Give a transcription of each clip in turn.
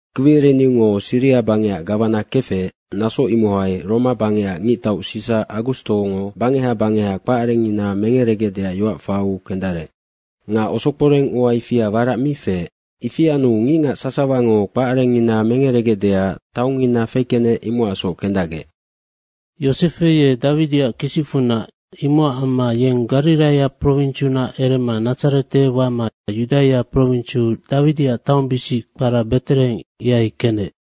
Kwiriniungo Siria bangecac gawana kefec, naso imohai Roma bangecac ngictau Sisa Agustongo bangeha bangeha kpacarengngina mengeregecdeac yoac faiu kendarec. Nga osokporeng ua ifia warac mi feec. Ifi anu ngicngac sasawango kpacarengngina mengeregecdeac taongngina fekenec, imocacsoc kendacgec. Yosefe ye Dawidiac kisicfunac, imocac amma yeng Gariraia prowinsiunac erema Nadzarete wama Yudaia prowinsiu Dawidiac taongbisic kpara Betereheng, ihai kenec.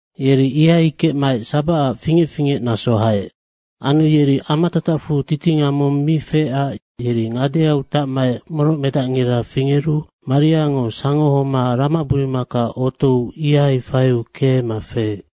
Yeri ihai kecmaec sabacac fingec fingecnaso haec. Anu yeri amatatacfu titinga mong mi feecac yeri ngadeau tacmaec morocmedacngira fingeru Mariango sangohoma ramaburumaka otou ihai faiu keema feec.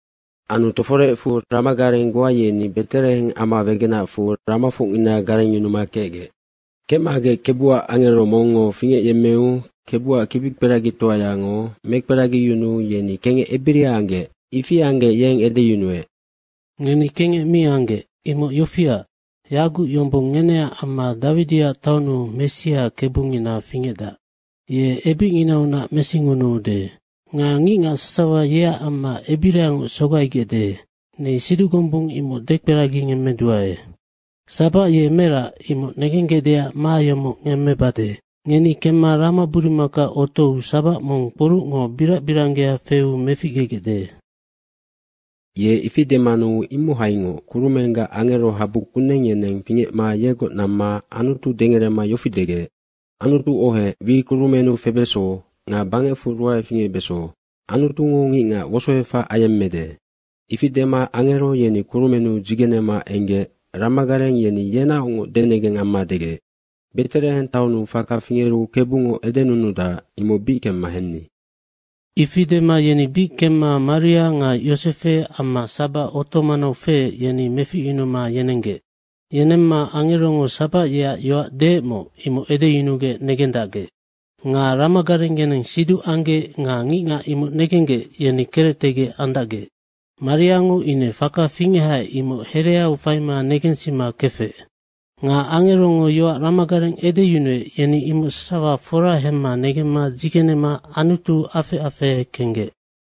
Anu toforecfu ramagareng goa yeni Betereheng ama wegenacfu ramafocngina garengyunuma kecgec. Kecmagec Kebuac angero mongngo fingecyemmeu Kebuac kibikperagitoayango mekperagiyunuu yeni kengec ebiria anggec. Ifi anggec yeng edeyunuec, “Ngeni kengec mi anggec. Imoc yofiac, yaguc yombong ngeneac amma Dawidiac taonnu Messia Kebungina fingecdac, ye ebicnginaunac mesingunuude. Nga ngicngac sasawa yeac amma ebiriangoc sogaigecde, ni siduc gombung imoc dekperagingemmeduae. Sabac ye merac imoc negenggecdeac ma yomoc ngemmebade, ngeni kemma ramaburumaka otou sabac mong kporucngo birac biranggea feu meficgegecde.” Ye ifi demanu imohaingoc kurumenggac angerohabu kuneng, yeneng fingecma yegoc namma Anutu dengerema yofi degec, “Anutu ohec, wi kurumennu febeso nga bangecfu ruae fingecbeso. Anutungo ngicngac wosoefac ayemmede.” Ifi dema angero yeni kurumennu dzigenema enggec ramagareng yeni yenaocngoc denegeng amma degec, “Betereheng taonnu faka fingeru Kebungo edenunudac, imoc bic kemma henni.” Ifi dema yeni bic kemma Maria nga Yosefe amma sabac oto manau feec, yeni meficyunuma yenenggec. Yenemma angerongo sabac yeac yoac deecmoc, imoc edeyunugec negendacgec. Nga ramagareng yeneng siduc anggec nga ngicngac imoc negenggec, yeni kerectegec andacgec. Mariango ine faka fingechaec, imoc hereau faima negensima kefec. Nga angerongo yoac ramagareng edeyunuec, yeni imoc sasawa fora hemma negemma dzigenema Anutu afec afehe kenggec.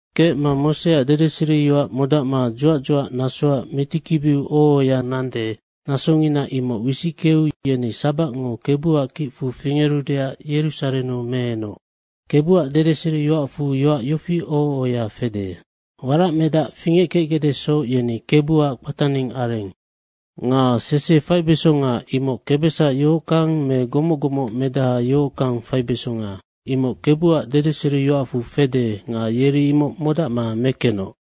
Kecma Moseac dedeseriyoac modacma dzuac dzuacnasoac mitikibiu oho ohoya nande, nasongina imoc wisickeu yeni sabacngo Kebuac kicfu fingerudeac Yerusarennu meenoc. Kebuac dedeseriyoacfu yoac yofi oho ohoya fede, “Waracmedac fingeckecgecdesoc yeni Kebuac kpataning areng.” Nga sese faibesonga, imoc kebesac yohockang me gomoc gomocmedaha yohockang faibesonga, imoc Kebuac dedeseriyoacfu fede nga yeri imoc modacma mekenoc.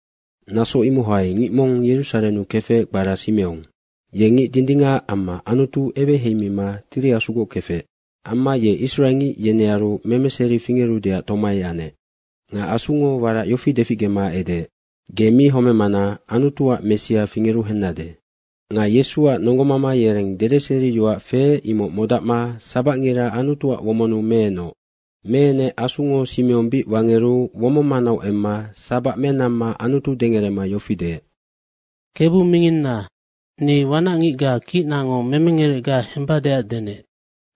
Naso imohai ngic mong Yerusarennu kefec, kpara Simeong. Ye ngic dindingac amma Anutu eweheimima Tiri Asugoc kefec. Amma ye Israengic yenearu memeseri fingerudeac tomai anec. Nga Asungo warac yofi deficgema edeec, “Ge mi homemana Anutuac Messia fingeru hennade.” Nga Yesuac nonggomama yereng dedeseriyoac feec, imoc modacma sabacngira Anutuac womonnu meenoc. Meenec Asungo Simeong bic wangeru womong manau emma sabac menamma Anutu dengerema yofi deec, “Kebu minginna, ni wanacngicga kicnango Memengerecga hembadeac denec,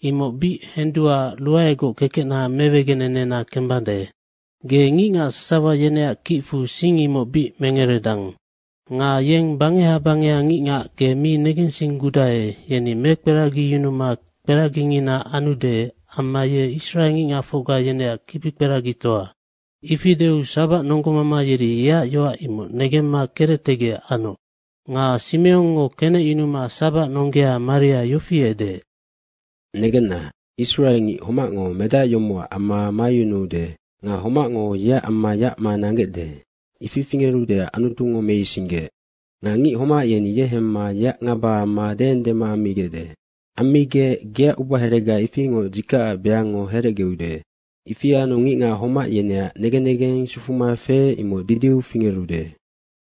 imoc bic henduaac ruaegoc kekecna mewegenena kembade. Ge ngicngac sasawa yeneac kicfu sing imoc bic mengeredang. Nga yeng bangeha bangeha ngicngac ge mi negensinggudae, yeni mekperagiyunuma kperagingina anude amma ye israengicngacfocga yeneac kibikperagitoa.” Ifi deu sabac nonggomama yeri yeac yoac imoc negemma kerectegec anoc. Nga Simeongngo kenecyunuma sabac nonggea Maria yofi edeec, “Negenna, Israengic homacngo medac yomocac amma mayunuude nga homacngo yeac amma yacma nanggecde, ifi fingerudeac Anutungo meisinggeec. Nga ngic homac yeni ye hemma yeac ngaba amma deendema ammigecde. Ammigec geac ubaherega ifingoc dzikacac beangngo herecgeude. Ifi anu ngicngac homac yeneac negen negeng sufuma feec, imoc didiu fingerude.”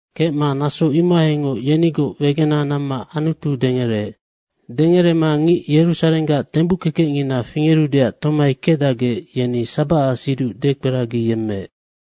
Kecma naso imohaingoc yenigoc wegena namma Anutu dengereec. Dengerema ngic Yerusarenggac tembuckekecngina fingerudeac tomai kecdacgec, yeni sabacac siduc dekperagiyemmeec.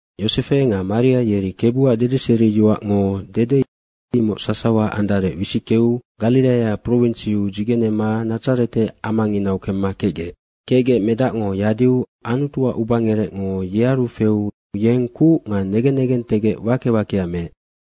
Yosefe nga Maria yeri Kebuac dedeseriyoacngo dede, imoc sasawa andarec wisickeu Gariraia prowinsiu dzigenema Nadzarete amanginau kemma kecgec. Kecgec medacngo yadiu Anutuac ubangerecngo yearu feu yeng kuc nga negen negentegec wake wakea meec.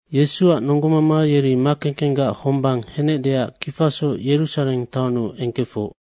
Yesuac nonggomama yeri makekenggac hombang henecdeac kifasoc Yerusareng taonnu engkefoc.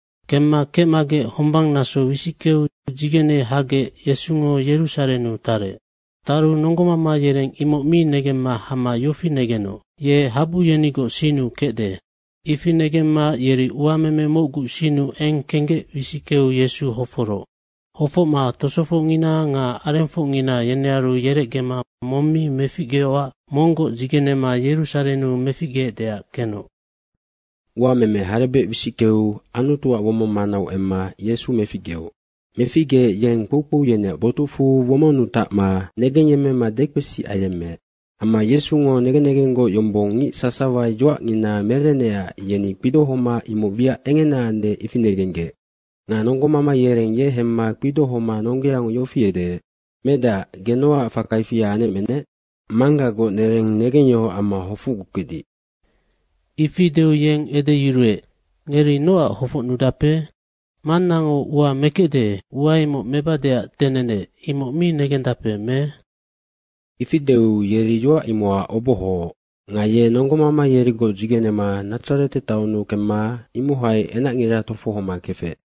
Kemma kecmagec hombang naso wisickeu dzigene hagec Yesungo Yerusarennu tarec. Taru nonggomama yereng imoc mi negemma hama yofi negenoc, “Ye habu yenigoc sinnu kecde.” Ifi negemma yeri uameme mocgu sinnu eng kenggec wisickeu Yesu hoforoc. Hofocma tosofocngina nga arengfocngina yenearu yerecgema mong mi meficgeocac monggoc dzigenema Yerusarennu meficgeecdeac kenoc. Uameme harebec wisickeu Anutuac womong manau emma Yesu meficgeoc. Meficgeec yeng kpoukpou yeneac botucfu womonnu tacma negengyemmema dekpesi ayemmeec. Amma Yesungo negen negenggoc yombong ngic sasawa yoacngina merenecac yeni kpidohoma imoc wiac engena ande, ifi negenggec. Nga nonggomama yereng ye hemma kpidohoma nonggeango yofi edeec, “Medac, ge nocac faka ifia anecmenec? Manggagoc nereng negengyohoc amma hofocgukecdic.” Ifi deu yeng edeyuruec, “Ngeri nocac hofocnudape? Mannango ua mekecde, ua imoc mebadeac denenec, imoc mi negendape me?” Ifi deu yeri yoac imocac obohooc. Nga ye nonggomama yerigoc dzigenema Nadzarete taonnu kemma imohai enacngira tofohoma kefec.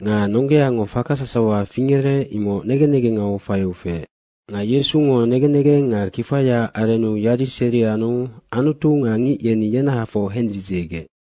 Nga nonggeango faka sasawa fingerec, imoc negen negengau faiu feec. Nga Yesungo negen negeng nga kifayaac arennu yadiseri anu Anutu nga ngic yeni yenahafoc hendzidziegec.